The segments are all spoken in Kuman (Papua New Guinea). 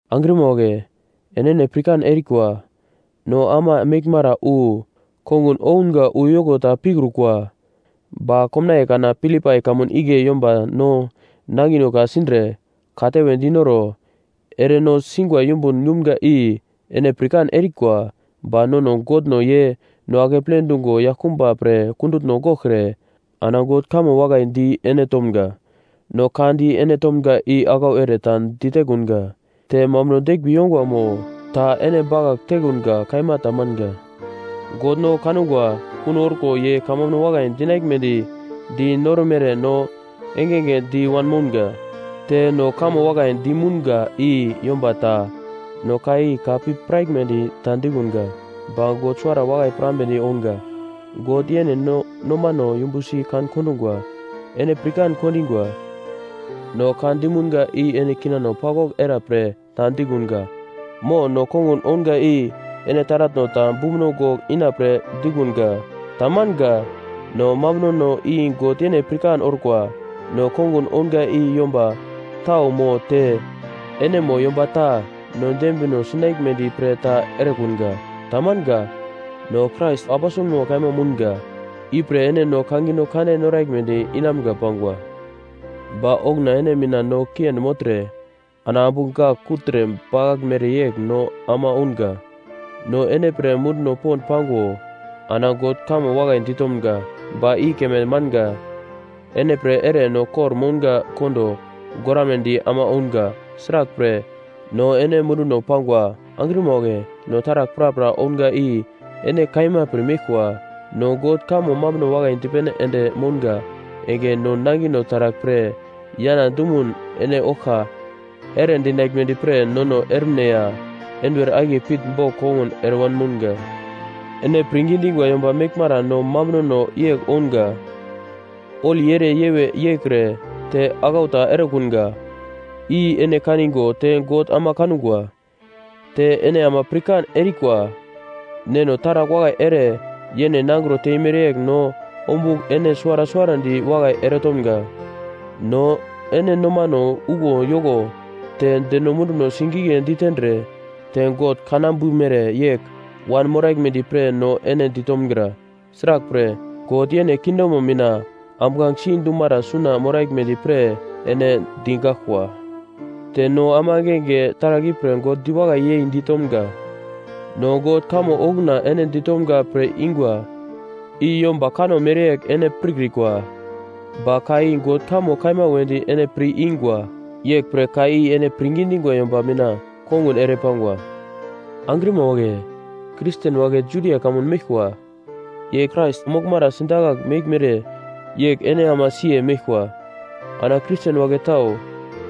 Angrima wagle, enene pirkan erikwa, no ama meglmara wu kongun ounga uyoko ta pikrukwa. Ba komnaiye kana Filipai kamun igle yomba no nangino ka-sindre, katewe dinoro ere no singwa yumbun yumga i ene pirkan erikwa. Ba nono Godno ye no akeple dungo yaglkumba pre kundutno goglkre ana God kamo mambuno wakai di ene tomga. No ka di ene tomga i aglau ere ta ditekunga, te mambuno deglmbi yongwa mo ta ene bakagl tekunga kaima tamanga. God no kangwa kuno orko ye kamambuno wakai dinaglmedi di noromere no engenge di wanmounga. Te no kamo wakai du mounga i yomba ta no ka i ka pir piraglmedi ta dikunga, ba God suwara wakai pirambedi ounga. God yene no nomano yumbusi kan-kondungwa. Ene pirkan kondingwa, no ka dimunga i ene kinano paglwagl era pre ta dikunga. Mo no kongun ounga i ene taratno ta bumbuno gogl inapre dikunga. Tamanga. No mambunono i God yene pirkan orkwa. No kongun ounga i yomba tau mo te ene mo yomba ta no dembino sinaglmedi pre ta erekunga. Tamanga. No Krais aposelma kaima mounga. Ipre ene no kangino kande noraglmedi inamga pangwa. Ba okuna ene mina no kiendi mogltre ana ambu gak kugltre bakaglmere yegl no ama ounga. No ene pre munduno pond pango ana God kamo wakai ditomga. Ba i keme manga, ene pre ere no kor-mounga kondo goramnedi ama ounga. Sraglpre no ene munduno pangwa. Angrima wagle no taragl prapra ounga i ene kaima pirmeglkwa, no God kamo mambuno wakai dipene ende mounga enge no nangino taragl pre yana dumun ene oglka eredinaglmedi pre nono ermine ya enduwer akiye pitnbogl kongun ere wanmounga. Ene pirngi dingwa yomba meglmara no mambunono yegl ounga, holi ere yewe yeikre te aglau ta erekunga, i ene kanigo te God ama kangwa. Te ene ama pirkan erikwa, neno taragl wakai ere yene nangro teimere yegl no ombugl ene suwara suwarandi wakai eretomga. No ene nomano uglo yoko te deno munduno sigigle ditendre, te God kanambumere yegl wanmoraglmedi pre no ene ditomgra. Sraglpre God yene kingdomo mina ambuglange si dumara suna moraglmedi pre ene digaglkwa. Te no ama engenge taragl ipre God diwakai yei ditomga. No God kamo okuna ene ditomga pir-ingwa i yomba kanno mereyegl ene pirkrikwa. Ba ka i God kamo kaima wedi ene pir-ingwa. Yeglpre ka i ene pirngi dingwa yomba mina kongun ere pangwa. Angrima wagle, Kristen wagle Judia kamun meglkwa ye Krais moglmara sidakagl meglmere yegl ene ama siye meglkwa. Ana Kristen wagle tau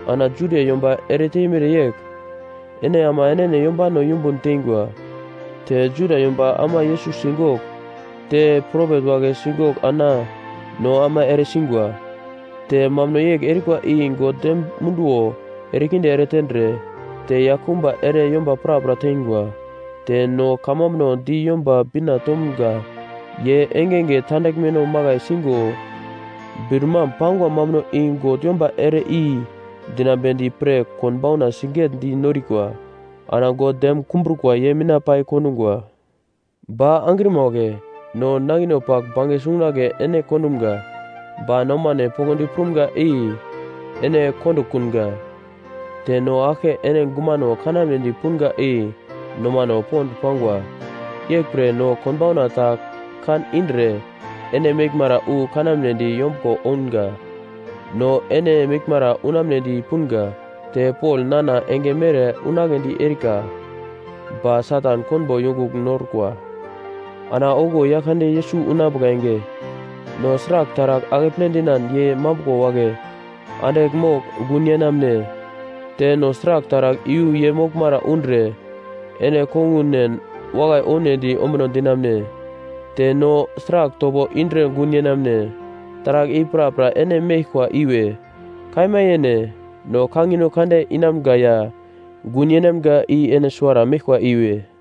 ana Judia yomba ere teimere yegl ene ama enene yombano yumbun teingwa. Te Juda yomba ama Yesus sigogl te propet wagle sigogl ana no ama ere singwa. Te mambuno yegl erikwa i God dem munduwo erekinde eretendre, te yaglkumba ere yomba prapra teingwa. Te no kamambuno di Yomba Bina tomga. Ye engenge tandaglmeno makai sigo bir-mam pangwa mambuno i God yomba ere-i dinambedi pre konbauna sigetdi norikwa. Ana God dem kumbrukwa ye mina pai kondungwa. Ba angrima wagle, no nangino pagl bange sungunagle ene kondumga, ba nomano poglodi prumga i ene kondokunga. Te no aglke ene gumano kanamedi punga i nomano pond pangwa. Yeglpre no konbauna ta kan indre ene meglmara wu kanamnedi yombuglo ounga. No ene meglmara unamnedi punga. Te Pol nana enge mere unagledi erika, ba Satan konbo yongugl norkwa. Ana okuwo Yaglkande Yesus unambuka enge, no sragl taragl akeple dinan ye mambuglo wagle andigl mogl gun yenamune? Te no sragl taragl iyu ye moglmara undre ene kongunen wakai ounedi ombuno dinamune? Te no sragl topo indre gun yenamune? Taragl i prapra ene meglkwa iwe. Kaima yene. No kangino kande inamga ya gun yeinamga i ene suwara meglkwa iwe.